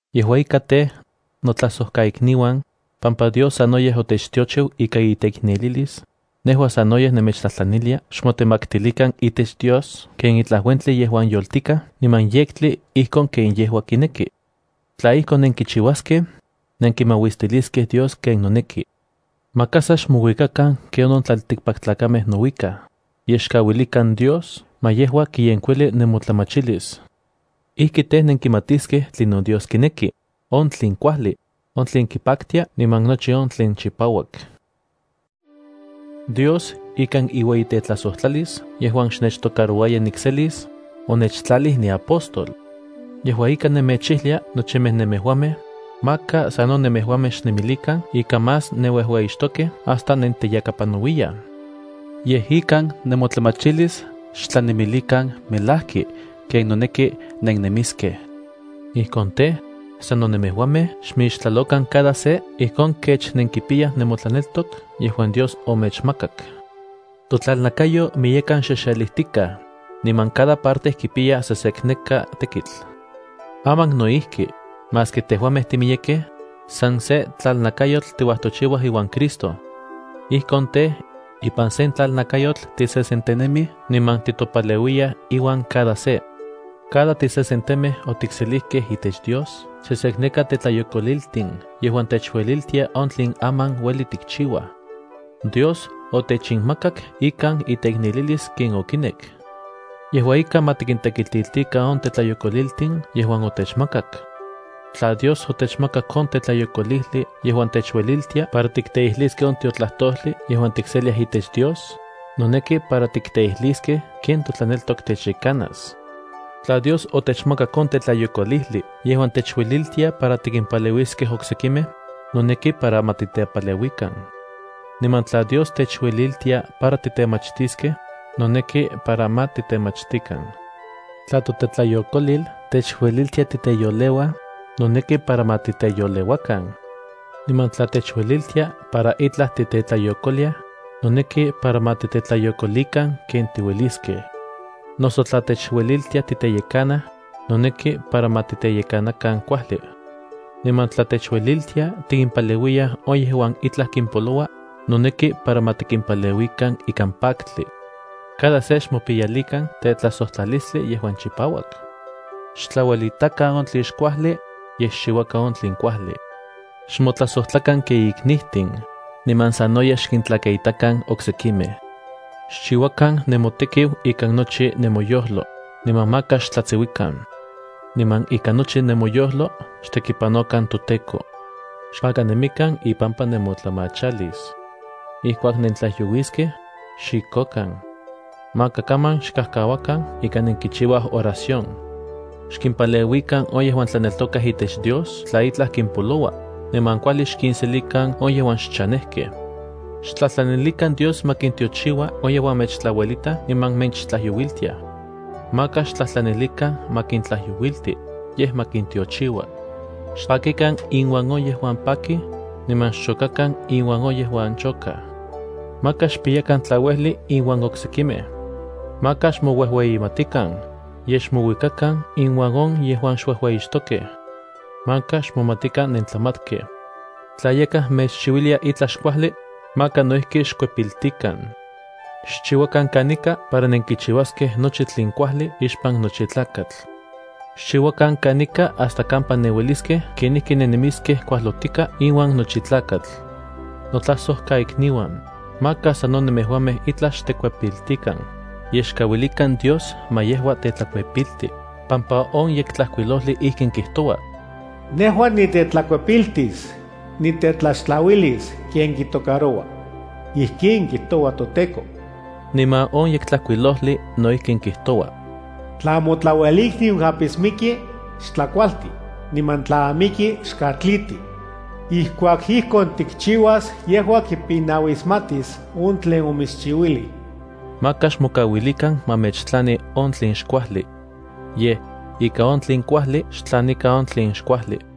Yejua ika tej, notlajsojkaikniuan, pampa Dios sanoyej otechtiochiu ikan iteiknelilis, nejua sanoyej nemechtlajtlanilia xmotemaktilikan itech Dios ken itlaj uentli yejuan yoltikaj niman yektli ijkon ken yejua kineki. Tla ijkon nenkichiuaskej, nenkimauistiliskej Dios ken noneki. Maka sa xmouikakan ken on tlaltikpaktlakamej nouikaj, yej xkauilikan Dios ma yejua kiyenkuili nemotlamachilis. Ijkin tej, nenkimatiskej tlinon Dios kineki: on tlen kuajli, on tlen kipaktia niman nochi on tlen chipauak. Dios, ikan iueyitetlajsojtlalis yejuan xnechtocarouaya nikselis, onechtlalij niapóstol. Yejua ika nemechijlia nochimej nemejuamej, maka sano nemejuamej xnemilikan ika más nenuejueyixtokej hasta nenteyakapanauiyaj. Yej ikan nemotlamachilis xtlanemilikan melajki ken noneki nennemiskej. Ijkon tej, sano nemejuamej xmixtlalokan cada se ijkon kech nenkipiyaj nemotlaneltok yejuan Dios omechmakak. Totlalnakayo miyekan xexelijtikaj, niman cada parte kipiya sesekneka tekitl. Aman no ijki, maski tejuamej timiyekej, san se tlalnakayotl tiuajtochiuaj iuan Cristo. Ijkon tej, ipan sen tlalnakayotl tisesentenemij niman titopaleuiyaj iuan cada se. Cada tisesentemej otikselijkej itech Dios sesekneka tetlayokoliltin yejuan techueliltia on tlen aman ueli tikchiuaj. Dios otechinmakak ikan iteiknelilis ken okinek. Yejua ika ma tikintekitiltikan on tetlayokoliltin yejuan otechmakak. Tla Dios otechmakak on tetlayokolijli yejuan techueliltia para tikteijliskej on tiotlajtojli yejuan tikseliaj itech Dios, noneki para tikteijliskej ken totlaneltok techyekanas. Tla Dios otechmakak on tetlayokolijli yejuan techueliltia para tikimpaleuiskej oksekimej, noneki para ma titepaleuikan. Niman tla Dios techueliltia para titemachtiskej, noneki para ma titemachtikan. Tla totetlayokolil techueliltia titeyoleuaj, noneki para ma titeyoleuakan. Niman tla techueliltia para itlaj tiktetlayokoliaj, noneki para ma tiktetlayokolikan ken tiueliskej. Noso tla techueliltia titeyekanaj, noneki para ma titeyekanakan kuajli. Niman tla techueliltia tikimpaleuiyaj on yejuan itlaj kimpoloua, noneki para ma tikimpaleuikan ikan paktli. Cada se xmopiyalikan tetlajsojtlalistli yejuan chipauak. Xtlauelitakan on tlen xkuajli, yej xchiuakan on tlen kuajli. Xmotlajsojtlakan ken iknitin, niman sanoyej xkintlakaitakan oksekimej. Xchiuakan nemotekiu ikan nochi nemoyojlo, niman maka xtlatsiuikan. Niman ikan nochi nemoyojlo xtekipanokan toTEKO. Xpakanemikan ipampa nemotlamachalis. Ijkuak nentlajyouiskej, xxikokan. Maka kaman xkajkauakan ika nenkichiuaj oración. Xkimpaleuikan on yejuan tlaneltokaj itech Dios tla itlaj kimpoloua, niman kuajli xkinselikan on yejuan xchanejkej. Xtlajtlanilikan Dios ma kintiochiua on yejuan mechtlauelitaj niman mechtlajyouiltiaj. Maka xtlajtlanilikan ma kintlajyouilti, yej ma kintiochiua. Xpakikan inuan on yejuan pakij, niman xchokakan inuan on yejuan chokaj. Maka xpiyakan tlauejli inuan oksekimej. Maka xmouejueyimatikan, yej xmouikakan inuan on yejuan xuejueyixtokej. Maka xmomatikan nentlamatkej. Tla yakaj mechchiuilia itlaj xkuajli, maka no ijki xkuepiltikan. Xchiuakan kanika para nenkichiuaskej nochi tlen kuajli ixpan nochi tlakatl. Xchiuakan kanika hasta kampa nenueliskej kenijki nennemiskej kuajlotika iuan nochi tlakatl. Notlajsojkaikniuan, maka sano nemejuamej itlaj xtekuepiltikan, yej xkauilikan Dios ma yejua tetlakuepilti, pampa on Yektlajkuilojli ijkin kijtoua: “Nejua nitetlakuepiltis; nitetlaxtlauilis ken kitocaroua. Ijkin kijtoua toTEKO.” Niman on Yektlajkuilojli no ijkin kijtoua: “Tla motlauelikniu apismiki, xtlakualti, niman tla amiki, xkatliti. Ijkuak ijkon tikchiuas yejua kipinauismatis on tlen omitschiuilij.” Maka xmokauilikan ma mechtlani on tlen xkuajli. Yej, ika on tlen kuajli xtlanikan on tlen xkuajli.